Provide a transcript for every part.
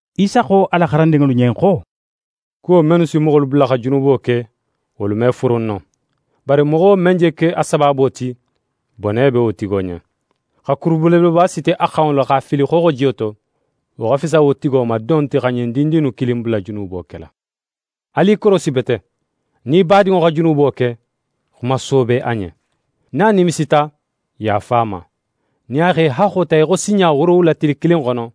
Isa xo a la xarandinŋolu ɲen xo: «Kuwo mennu si moxolu bula xa junubo ke, wolu me furun no. Bari moxo men je ke a sabaabo ti, bone be wo tigo ɲen. Xa kuru belebeleba siti a xanŋo la, x'a fili xooxojiyo to, wo xa fisa wo tigo ma don ti xa ɲin dindin innu kilin bula junubo kela. Alu i korosi bete! «Nin í badinŋo xa junubo ke, xuma soobe a ɲen. Nin a nimisita, yaafa a ma. Nin a x'é haxxo ta í xo sinɲa woorowula tili kilin xono,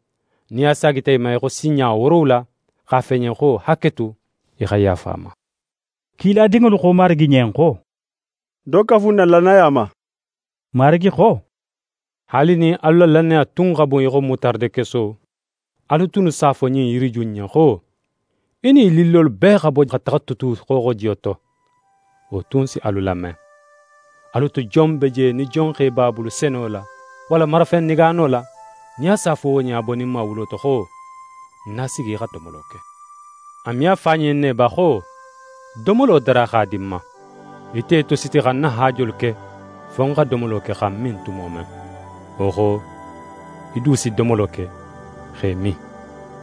nin a saagita í ma sinɲa woorowula, x'a fo í ɲen xo: “Haketu,” í xa yaafa a ma.» Kiladinŋolu xo Marigi ɲen xo: «Do kafu n na lannaya ma.» Marigi xo: «Haali nin alu la lannaya tun xa bun í xo mutaradekeso, alu tunnu s'a fo ɲin yiriju in ɲen xo: “Í nin í lillolu bee xa bo xa taxa tutu xooxojiyo to”, wo tun si alu lame.» «Alu to jon be je, nin jonxe b'a bulu seno la, walla marafen negaano la, nin a s'a fo wo ɲen a boninma wulo to xo: “Na sigi, í xa domolo ke?” A me a fo a ɲen ne ba xo: “Domolo dara x'a di ń ma. Í tetositi xa ń na haajolu ke fo ń xa domolo ke xa ń min tumo men. Wo xo, í du si domolo ke x'é min.”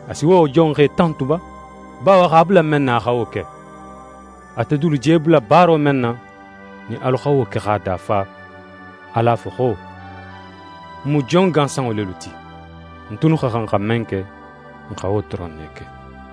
A si wo jonxe tantu ba, bawo a x'a bula men na, a xa wo ke? Atelu dulu je bula baaro men na, nin alu xa wo ke x'a dafa, alu a fo xo: “N mu jon gansanŋo lelu ti. N tunnu xa xan xa men ke, n xa wo doron ne ke.”»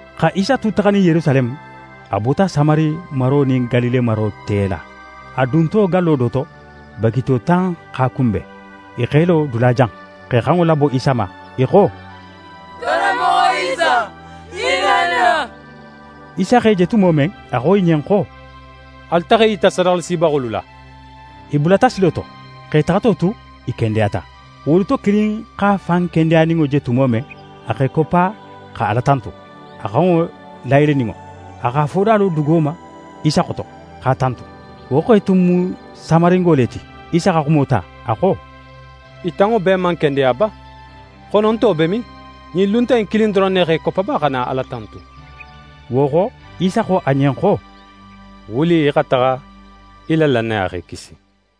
Xa Isa tu taxanin Yerusaleme, a bota Samari maro nin Galile maro te la. A dunto gallo do to, bagito tan x'a kunben. I x'e lo dulajan, x'e xanŋo labo Isa ma. I xo: «Karanmoxo Isa, hinna n na!» Isa x'e je tumo men, a xo i ɲen xo: «Alu taxa i yita sadaxalasibaxolu la.» I bulata silo to. X'e taxato tu, i kendeyata. Wolu to kilin x'a fan kendeyaninŋo je tumo men, a x'é koppa xa Ala tantu, a xanŋo layeleninŋo. A x'a foda lo dugo ma Isa xoto, x'a tantu. Wo xe tun mu Samaringo le ti. Isa xa xumo ta, a xo: «I tanŋo bee man kendeya ba? Xononto be min? Ɲin luntan in kilin doron ne x'é koppa ba xa na Ala tantu?» Wo xo, Isa xo a ɲen xo: «Wuli í xa taxa. Í la lannaya x'é kisi.»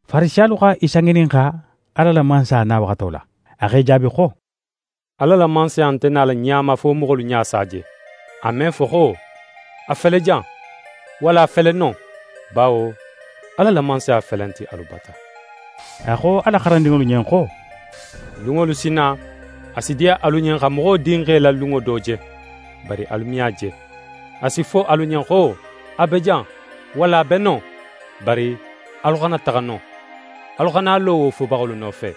Farisiyalu xa Isa ŋininxa Ala la Mansaya na waxato la. A x'e jaabi xo: «Ala la Mansaya nte nala ɲa ma, fo moxolu ɲa s'a je. A me fo xo: “A fele jan!” walla: “A fele non!” Bawo Ala la Mansaya felenti alu bata.» A xo a la xarandinŋolu ɲen xo: «Lunŋolu si na, a si diya alu ɲen xa Moxo Dinxe la lunŋo do je, bari alu me a je. A si fo alu ɲen xo: “A be jan!” walla: “A be non!” Bari alu xana taxa non, alu xana a lo wo fobaxolu nofe.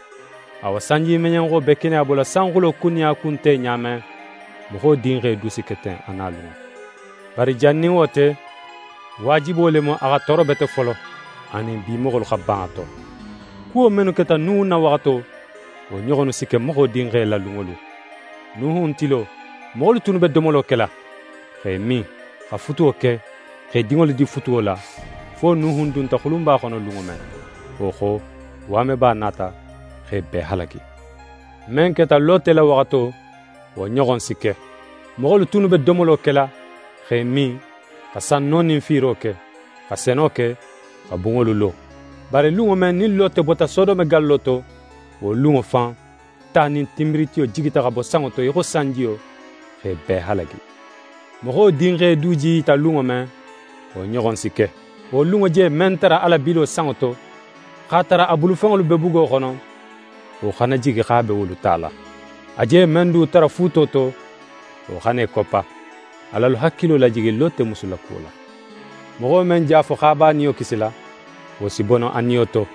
Awa, sanjimeɲenxo be keneya bola sanxulo kun nin a kun te ɲa men, Moxo Dinxe du si ke ten a nalunŋo. Bari jan nin wo te, waajibo le mu, a xa tooro bete folo, anin bi moxolu xa ban a to. Kuwo mennu keta Nuhun na waxato, wo ɲoxonnu si ke Moxo Dinxe la lunŋolu. Nuhun tilo, moxolu tunnu be domolo kela, x'e min, xa futuwo ke, x'e dinŋolu di futuwo la, fo Nuhun dunta xulunba xono lunŋo men. Wo xo, waameba nata x'e bee halagi. Men keta Lote la waxato, wo ɲoxon si ke. Moxolu tunnu be domolo kela x'e min, xa sanno nin fiiro ke, xa seno ke, xa bunŋolu lo. Bari lunŋo men, nin Lote bota Sodome gallo to, wo lunŋo fan, ta nin tinbiritiyo jigita xa bo sanŋo to í xo sanjiyo, x'e bee halagi. Moxo Dinxe du je í yita lunŋo men, wo ɲoxon si ke. «Wo lunŋo je men tara a la bilo sanŋo to, x'a tara a bulufenŋolu be bugo xono, wo xana jigi x'a be wolu tala. A je men du tara fuuto to, wo xana í koppa. Al'alu hakilo lajigi Lote musu la kuwo la. Moxo men je a fo xo a be a niyo kisila, wo si bono a niyo to.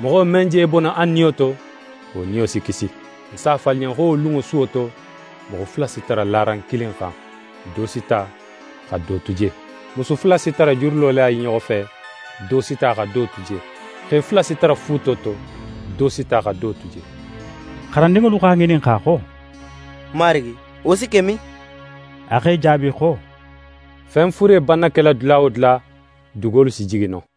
Moxo men je bono a niyo to, wo niyo si kisi. Ń s'a fo alu ɲen xo wo lunŋo suwo to, moxo fula si tara laran kilin xan: Do si ta, xa do tu je. Musu fula si tara jurilo la i ɲoxo fe: Do si ta, xa do tu je. [ Xe fula si tara fuuto to: Do si ta, xa do tu je.]» Xarandinŋolu x'a ŋininxa xo: «Marigi, wo si ke min?» A x'e jaabi xo: «Fen fure banna kela dula wo dula, dugolu si jigi non.»